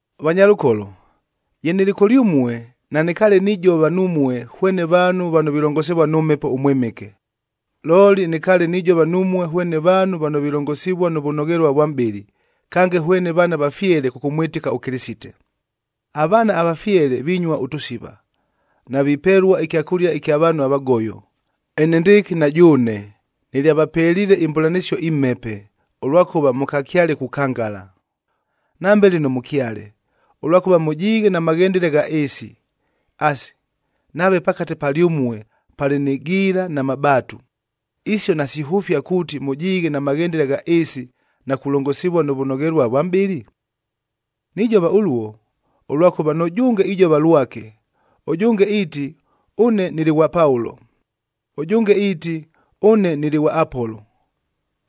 Vanyalʉkolo, ye nɨlɨ kʉlyʉmue, nanɨkaale nijova numue hwene vaanhu vano vilongosivua nʉ Mhepo ʉMwɨmɨke, looli nɨkaale nijova numue hwene vaanhu vano vilongosivua nʉ vʉnoghelua vwa mʼbɨlɨ, kange hwene vaana vafyele kʉkʉmwɨtɨka ʉKɨlɨsite. Avaana avafyele vinyua ʉtʉsiva, navipelua ɨkyakʉlia ɨkya vaanhu avagoyo, enendɨɨkɨ na jʉʉne nɨlyavapeliile imbʉlanɨsio imhepe, ʉlwakʉva mʉkakyale kukangala. Nambe lɨno mʉkyale, ʉlwakʉva mʉjiighe na maghendele gha ɨɨsi. Asi, nave pakate palyʉmue palɨ nɨ giila na mabaatu, isio nasihʉfia kuuti mʉjiighe na maghendele gha ɨɨsi na kulongosivua nʉ vʉnoghelua vwa mʼbɨlɨ? Nijova ʉluo, ʉlwakʉva nʉjʉnge ijova lwake, ʉjʉnge iiti, “Ʉne nɨlɨ ghwa Paulo,” ʉjʉnge iiti, “Ʉne nɨlɨ ghwa Apolo.”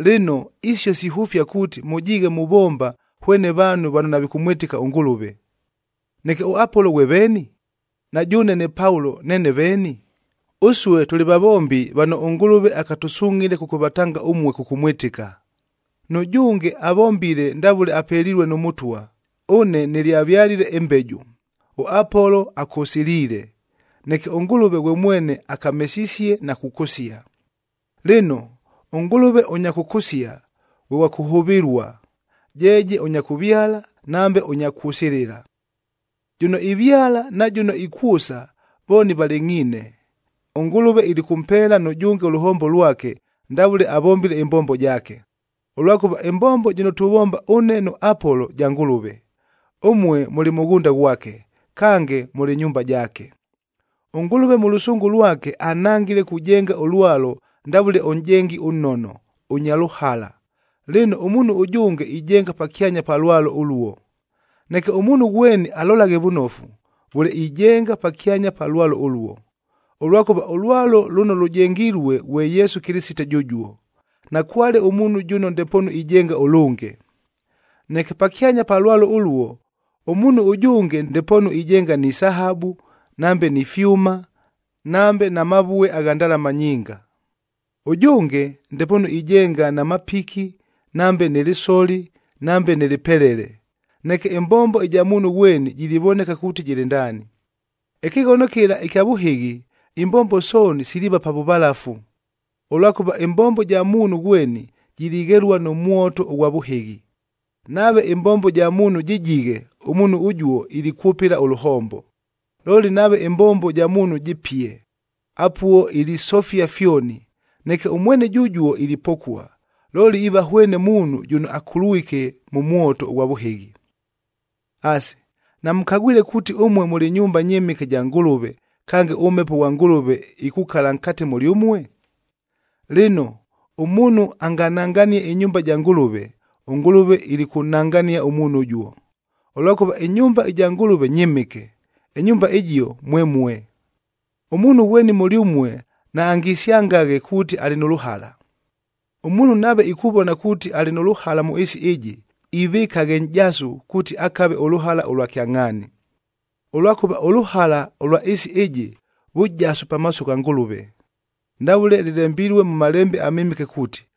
Lɨno, isio sihʉfia kuuti, mʉjiighe muvomba hwene vaanhu vano navikʉmwɨtɨka ʉNgʉlʉve. Neke ʉApolo ghwe veeni? Na jʉʉne ne Paulo neene veeni? Ʉsue tʉlɨ vavombi vano ʉNgʉlʉve akatʉsungʼhile kʉkʉvatanga ʉmue kʉkʉmwɨtɨka. Nʉjʉnge avombile ndavʉle apelilue nʉ Mʉtwa. Ʉne nɨlyavyalile ɨmbeju, ʉApolo akʉsɨliile, neke ʉNgʉlʉve ghwe mwene akamesisie na kukʉsia. Lɨno, ʉNgʉlʉve ʉnya kʉkʉsia ghwe ghwa kʉhʉvɨlua, jeeje ʉnya kʉvyala nambe ʉnya kwʉsɨlɨla. Jʉno ivyala na jʉno ikwʉsa vooni valɨngʼhiine, ʉNgʉlʉve ilikʉmpeela nʉjʉnge ʉlʉhombo lwake, ndavʉle avombile ɨmbombo jaake. Ʉlwakʉva ɨmbombo jɨno tuvomba ʉne nʉ Apolo ja Ngʉlʉve, ʉmue mʉlɨ mʉghʉnda ghwake. Kange, mʉlɨ nyumba jaake. ɄNgʉlʉve mʉ lʉsʉngʉ lwake anhangile kujenga ʉlwalo ndavʉle ʉnʼjengi ʉnnono, ʉnya lʉhala, lɨno ʉmuunhu ʉjʉnge ijenga pakyanya pa lwalo ʉluo. Neke ʉmuunhu ghweni alolaghe vʉnofu, vʉle ijenga pakyanya pa lwalo ʉluo. Ʉlwakʉva ʉlwalo lʉno lʉjengilue ghwe Yesu Kɨlɨsite jʉjuo. Nakwale ʉmuunhu jʉno ndepoonu ijenga ʉlʉnge. Neke pakyanya pa lwalo ʉluo, ʉmuunhu ʉjʉnge ndepoonu ijenga ni sahabu, nambe ni fyʉma, nambe na mavue agha ndalama nyinga. Ʉjʉnge ndepoonu ijenga na mapiki, nambe nɨ lɨsoli, nambe nɨ lɨpelele. Neke ɨmbombo ɨja muunhu ghweni jilivoneka kuuti jɨlɨ ndaani. Ɨkɨghono kɨla ɨkya vʉhɨghi imbombo sooni siliiva pa vʉvalafu, ʉlwakʉva ɨmbombo ja muunhu ghweni, jilighelua nʉ mwoto ʉghwa vʉhɨghi. Nave ɨmbombo ja muunhu jɨjighe, ʉmuunhu ʉjuo ilikwʉpɨla ʉlʉhombo. Looli nave ɨmbombo ja muunhu jɨpie, apuo ilisofia fyoni, neke ʉmwene jʉjuo ilipokua, looli iiva hwene muunhu jʉno akulwike mʉ mwoto ʉghwa vʉhɨghi. Asi, namʉkagwile kuuti ʉmue mʉlɨ nyumba nyɨmɨke ja Ngʉlʉve, kange ʉMhepo ghwa Ngʉlʉve ikukala nkate mʉlyʉmue? Lɨno, ʉmuunhu angananganie ɨnyumba ja Ngʉlʉve, ʉNgʉlʉve ilikʉnnangania ʉmuunhu ʉjuo. Ʉlwakʉva ɨnyumba ɨja Ngʉlʉve nyɨmɨke, ɨnyumba ɨjio mwemue. Ʉmuunhu ghweni mʉlyʉmue naangisyangaghe kuuti alɨ nʉ lʉhala. Ʉmuunhu nave ikuvona kuuti alɨ nʉ lʉhala mʉ ɨɨsi ɨjɨ, ivɨkaghe nʼjasu kuuti akave ʉlʉhala ʉlwa kyangʼhaani. Ʉlwakʉva ʉlʉhala ʉlwa ɨɨsi ɨjɨ, vʉjasu pamaaso gha Ngʉlʉve. Ndavʉle lɨlembilue mʉ Malembe aMɨmɨke kuuti,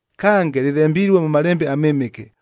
Kange, lɨlembilue mʉ Malembe aMɨmɨke,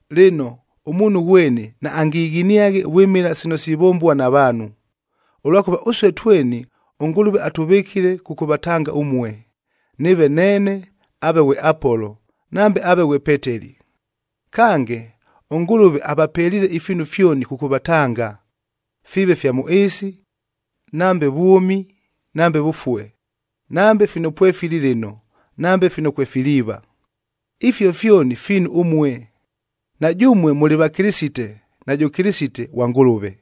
Lɨno, ʉmuunhu ghweni naangighiniaghe vwɨmɨla sino sivombua na vaanhu. Ʉlwakʉva ʉsue tweni ʉNgʉlʉve atʉvɨkile kʉkʉvatanga ʉmue, nɨɨve neene, aave ghwe Apolo, nambe aave ghwe Peteli. Kange, ʉNgʉlʉve avapeliile ifiinu fyoni kʉkʉvatanga, fiive fya mʉ ɨɨsi, nambe vwʉmi, nambe vʉfue; nambe fino pwefili lɨno, nambe fino kwefiliiva. Ifio fyoni fiinu ʉmue, na jʉmue mʉlɨ va Kɨlɨsite, najʉ Kɨlɨsite ghwa Ngʉlʉve.